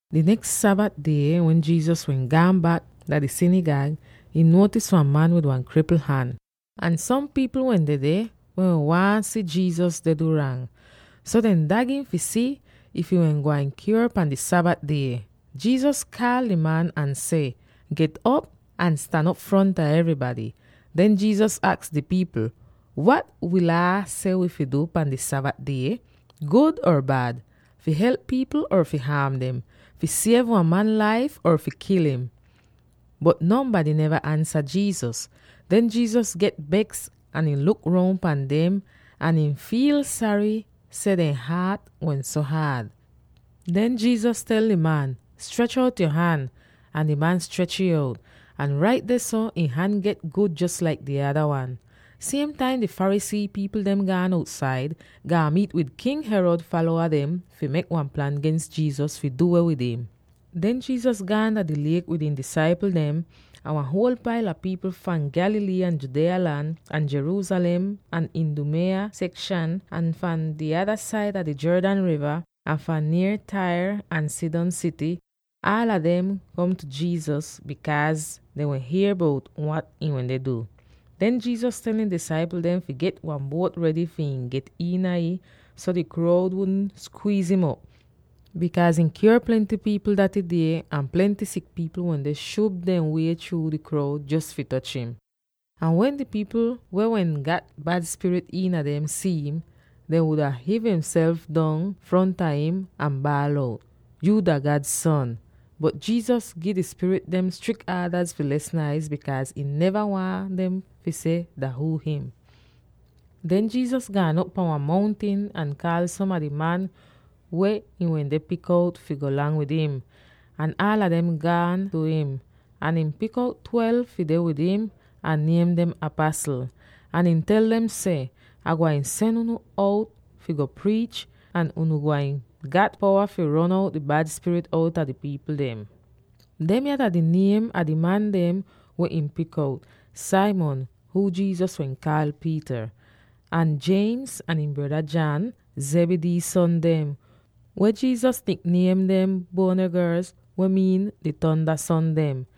Di neks Sabat die wen Jesus wehn gaan bak dah di sinigag, ihn nuotis wan man wid wan kripl han. Ahn som pipl wehn dedeh, weh wehn waahn si Jesus deh du rang. So dehn dag im fi si if ihn wehn gwain kyuor pan di Sabat die. Jesus kaal di man ahn seh, “Get'op ahn stan op fronta evrybady.” Den Jesus aks di pipl, “Wat wi Laa seh wi fi du pan di Sabat die? Gud or bad? Fi help pipl or fi haam dem? Fi siev wan man laif or fi kil im?” Bot nonbady neva ansa Jesus. Den Jesus get beks ahn ihn luk roun pan dem, ahn ihn fiil sary seh dehn haat wehn so haad. Den Jesus tel di man, “Strech out yo han!” Ahn di man strech'ih out, ahn rait dehso ihn han get gud jos laik di ada wan! Siem taim di Pharisee pipl dem gaan outsaid, gaan miit wid King Herod falowa dem fi mek wan plan gens Jesus fi du weh wid im. Den Jesus gaan dah di liek wid ihn disaipl dem, ahn wan huol paila pipl fahn Galilee, ahn Judea lan, ahn Jerusalem, ahn Idumea sekshan, ahn fahn di ada saida di Jordan riva, ahn fahn nier Tyre ahn Sidon sity, aala dem kom tu Jesus, bikaaz dehn wehn hier bout wat ihn wende du. Den Jesus tel ihn disaipl dem fi get wan buot redy fi ihn get iina ih so di kroud wudn skwiiz'im op, bikaaz ihn kyuor plenty pipl daty die, ahn plenty sik pipl wende shub dehn wie chruu di kroud jos fi toch im. Ahn wen di pipl weh wehn gat bad spirit iina dem si'im, dehn wuda hiiv dehnself dong fronta im ahn baal out, “Yu dah God Son!” Bot Jesus gi di spirit dem strik aadaz fi les naiz, bikaaz ihn neva waahn dehn fi seh dah huu him. Den Jesus gaan op pan wan mountin ahn kaal som a di man weh ihn wende pik out fi go lang wid im, ahn aala dem gaan tu im. Ahn ihn pik out twelve fi deh wid im, ahn niem dem apasl. Ahn ihn tel dem seh, “Ah gwain sen unu out fi go priich, ahn unu gwain gat powa fi ron out di bad spirit outa di pipl dem.” Demya dah di niem a di man dem wehn ihn pik out: Simon —huu Jesus wehn kaal Peter— ahn James ahn ihn breda John —Zebedee son dem— weh Jesus nik-niem dem, Boanerges, weh miin, “Di Tonda Son dem,”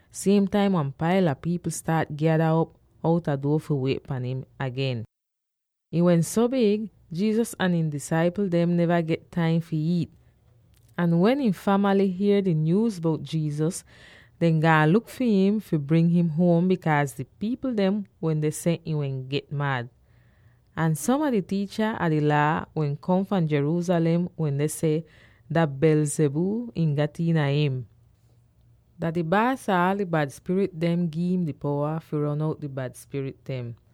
Siem taim wan paila pipl staat gyada op outa duo fi wiet pahn im agen. Ih wehn so big, Jesus ahn ihn disaipl dem neva get taim fi iit. Ahn wen ihn famaly hier di nyuuz bout Jesus, dehn gaan luk fi im fi bring im huom, bikaaz di pipl dehn wende seh ihn wehn get mad. Ahn som a di tiicha a di Laa weh kom fahn Jerusalem wende seh, “Dah Beelzebul ihn gat iina im. Dah di baas ah aal di bad spirit dem gi'im di powa fi ron out di bad spirit dem.”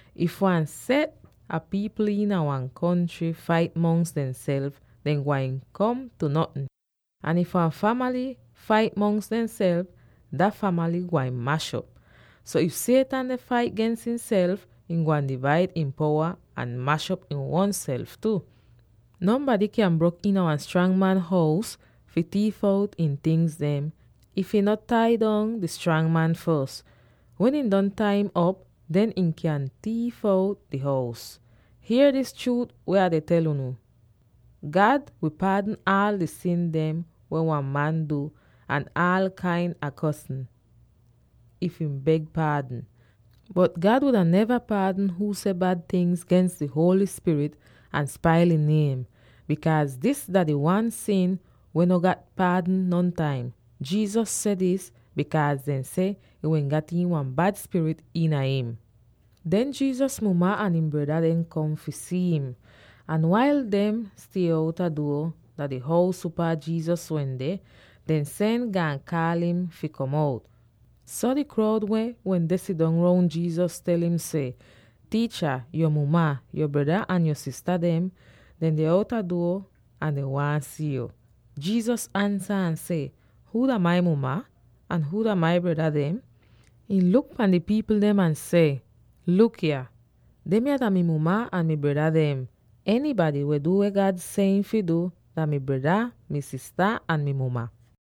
If wan set a pipl iina wan kontry fait mongs demself, dehn gwain kom tu notn. Ahn if wan famaly fait mongs demself, dah famaly gwain mash'op. So if Satan deh fait gens ihnself, ihn gwain divaid ihn powa ahn mash'op ihn uonself tu. “Nonbady kyan brok iina wan strang man hous fi tiif out ihn tingz, if ihn no tai dong di strang man fos. Wen ihn don tai'im op, den ihn kyan tiif out di hous. “Hier dis chruut weh Ah deh tel unu: God wi paadn aal di sin dem weh wan man du ahn aal kain a kosn, if ihn beg paadn. Bot God wuda neva paadn huu seh bad tingz gens di Holy Spirit ahn spail ihn niem, bikaaz dis dah di wan sin weh no gat non paadn nontaim.” Jesus seh dis bikaaz dehn seh ihn wehn gat iin wan bad spirit iina im. Den Jesus muma ahn ihn breda dem kom fi si'im. Ahn wail dehn stie outa duo dah di hous upaa Jesus wende, dehn sen gaan kaal im fi kom out. So di kroud weh wende sidong roun Jesus tel im seh, “Tiicha, yo muma, yo breda ahn yo sista dem deh outa duo, ahn dehn waahn si yo.” Jesus ansa ahn seh, “Huu dah mai muma? Ahn huu dah mai breda dem?” Ihn luk pan di pipl dem ahn seh, “Luk yah! Demya dah mi muma ahn mi breda dem. Enybady weh du weh God seh ihn fi du, dah mi breda, mi sista, ahn mi muma.”